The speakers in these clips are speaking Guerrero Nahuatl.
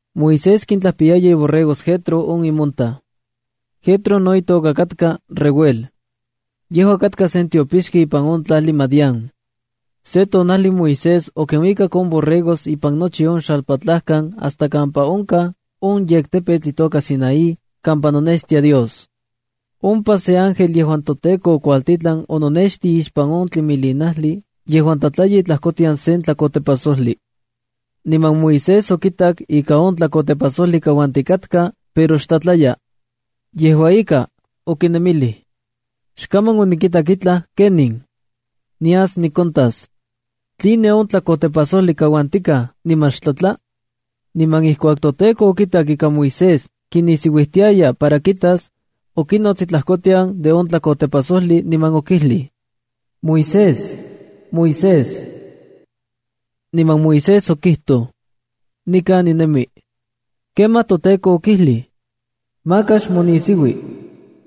Moisés kintlajpiyaya iborregos Jetro on imontaj. Jetro no itoka katka Reuel. Yejua katka sen tiopixki ipan on tlajli Madián. Se tonajli Moisés okinuikak on borregos ipan nochi on xalpatlajkan hasta kampa onkaj on yektepetl itoka Sinaía kampa nonextia Dios. Ompa se ángel yejuan toTEKO okuajtitlan ononextij ipan sen tlimilinajli yejuan tlatlaya itlajkotian sen tlakotepajsojli. Niman Moisés okitak ika on tlakotepajsojli kauantikatka, pero xtlatlaya. Yejua ika, okinemilij: “Xkaman onikitak itlaj ken in. Nias nikontas. ¿Tline on tlakotepajsojli kauantikatkaj niman xtlatla?” Niman ijkuak toTEKO okitak ika Moisés kinisiuijtiaya para kitas, okinots itlajkotian de on tlakotepajsojli niman okijlij: —¡Moisés! ¡Moisés! Niman Moisés okijtoj: —Nikan ninemi. Kemaj toTEKO okijlij: —Maka xmonisiui.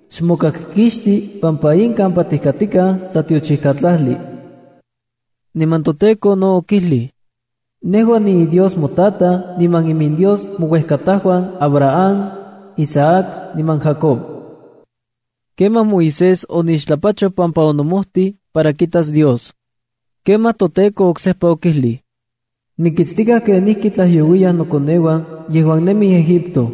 Xmokakkixti pampa in kampa tijkatikaj tlatiochijkatlajli. Niman toTEKO no okijlij: —Nejua niiDios motataj niman iminDios mouejkatajuan Abraham, Isaac niman Jacob. Kemaj Moisés onixtlapachoj pampa onomojtij para kitas Dios. Kemaj toTEKO oksejpa okijlij: —Nikitstikaj kenijkitlajyouiyaj nokoneuan yejuan nemij Egipto.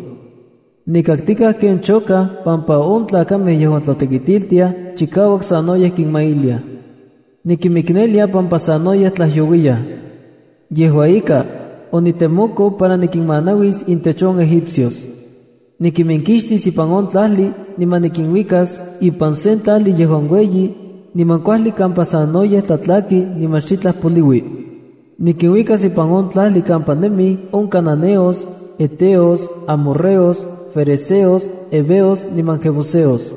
Nikaktikaj ken chokaj pampa on tlakamej yejuan tlatekitiltiaj chikauak sanoyej kinmailiaj. Nikinmiknelia pampa sanoyej tlajyouiyaj. Yejua ika, onitemoko para nikinmanauis intech on egipcios. Nikiminkixtis ipan on tlajli, niman nikinuikas ipan sen tlajli yejuan ueyi, niman kuajli kampa sanoyej tlatlaki niman xitlaj poliui. Nikinuikas ipan on tlajli kampa nemij on cananeos, heteos, amorreos, ferezeos, heveos niman jebuseos.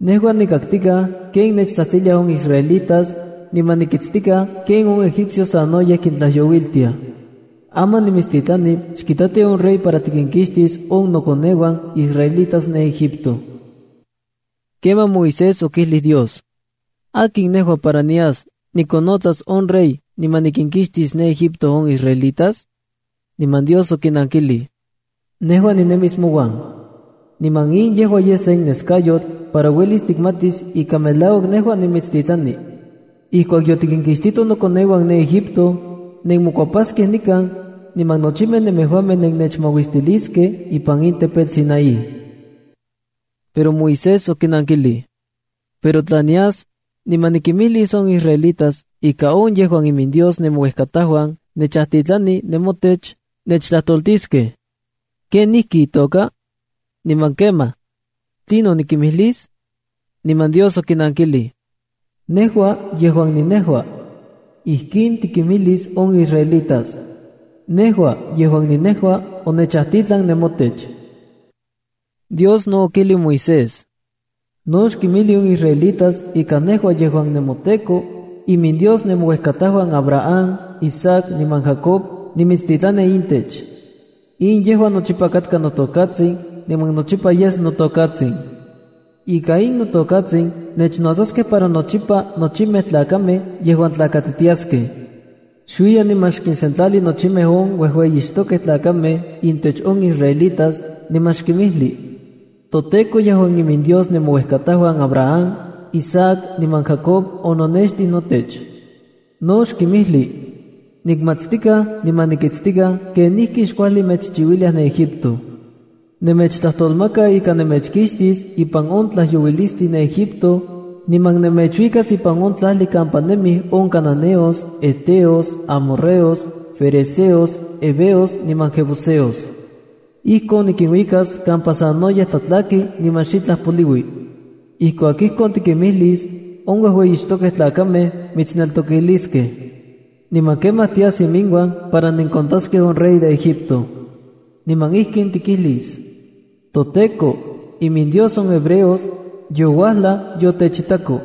Nejua nikaktikaj ken nechtsajtsiliaj on israelitas, niman nikitstikaj ken on egipcios sanoyej kintlayouiltiaj. Aman nimitstitlani xkitati on rey para tikinkixtis on nokoneuan israelitas ne Egipto. Kemaj Moisés okijlij Dios: —¿Akin nejua para nias nikonnotsas on rey, niman nikinkixtis ne Egipto on israelitas? Niman Dios okinankilij: —Nejua ninemis mouan. Niman in yejua yes sen neskayotl para uelis tikmatis ika melauak nejua nimitstitlani: ijkuak yotikinkixtito nokoneuan ne Egipto, nenmokuepaskej nikan, niman nochimej nemejuamej nennechmauistiliskej ipan in tepetl Sinaí. Pero Moisés okinankilij: —Pero tla nias, niman nikinmijlis on israelitas ika on yejuan iminDios nemouejkatajuan nechajtitlani ne motech, nechtlajtoltiskej: ¿Ken ijki itoka? Niman kemaj, ¿tlinon nikinmijlis? Niman Dios okinankilij: —NEJUA YEJUAN NINEJUA. Ijkin tikinmijlis on israelitas: “NEJUA YEJUAN NINEJUA onechajtitlan nemotech.” Dios no okijlij Moisés: —No xkinmijli on israelitas ika nejua yejuan nemoTEKO, iminDios nemouejkatajuan Abraham, Isaac niman Jacob nimitstitlani intech. In yejua nochipa katka notokatsin niman nochipa yes notokatsin. Ika in notokatsin nechnotsaskej para nochipa nochimej tlakamej yejuan tlakatitiaskej. Xuiya niman xkinsentlali nochimej on uejueyixtokej tlakamej intech on israelitas, niman xkinmijli: “ToTEKO yejuan iminDios nemouejkatajuan Abraham, Isaac niman Jacob ononextij notech.” No xkinmijli: “Nikmatstikaj niman nikitstikaj kenijkixkuajli mechchiuiliaj ne Egipto. Nemechtlajtolmaka ika nemechinkixtis ipan on tlajyouilistli ne Egipto, niman nemechuikas ipan on tlajli kampa nemij on cananeos, heteos, amorreos, ferezeos, heveos niman jebuseos. Ijkon nikinuikas kampa sanoyej tlatlaki niman xitlaj poliui.” Ijkuak ijkon tikimijlis, on uejueyixtokej tlakamej mitsneltokiliskej. Niman kemaj tias iminuan para nenkontaskej on rey de Egipto. Niman ijkin tikijlis: “ToTEKO, iminDios on hebreos, youajlaj yotechitako.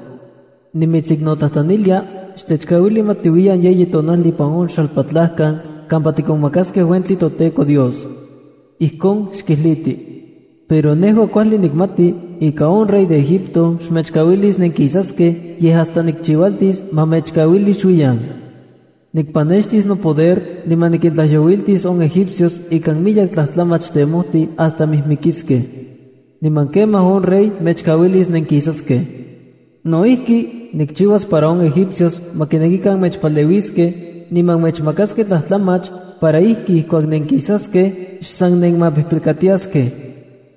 Nimitsiknotlajtlanilia, xtechkauili ma tiuiyan yeyi tonajli ipan on xalpatlajkan kampa tikonmakaskej uentli toTEKO Dios.” Ijkon xkijliti. Pero nejua kuajli nikmati ika on rey de Egipto xmechkauilis nenkisaskej yej hasta nikchiualtis ma mechkauili xuiyan. Nikpanextis nopoder, niman nikintlajyouiltis on egipcios ikan miyek tlajtlamach tejmoti hasta mijmikiskej. Niman kemaj on rey mechkauilis nenkisaskej. No ijki, nikchiuas para on egipcios ma kinekikan mechpaleuiskej, niman mechmakaskej tlajtlamach, para ijki ijkuak nenkisaskej, xsan nenmapijpilkatiaskej.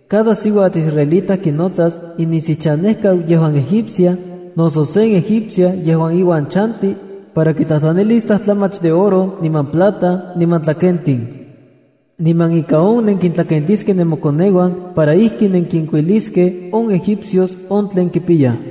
Cada siuatl israelita kinotsas inisiuchanejkau yejuan egipcia, noso sen egipcia yejuan iuan chanti, para kitlajtlanilis tlajtlamach de oro niman plata niman tlakentin. Niman ika on nenkintlakentiskej nemokoneuan para ijki nenkinkuiliskej on Egipcios on tlen kipiyaj.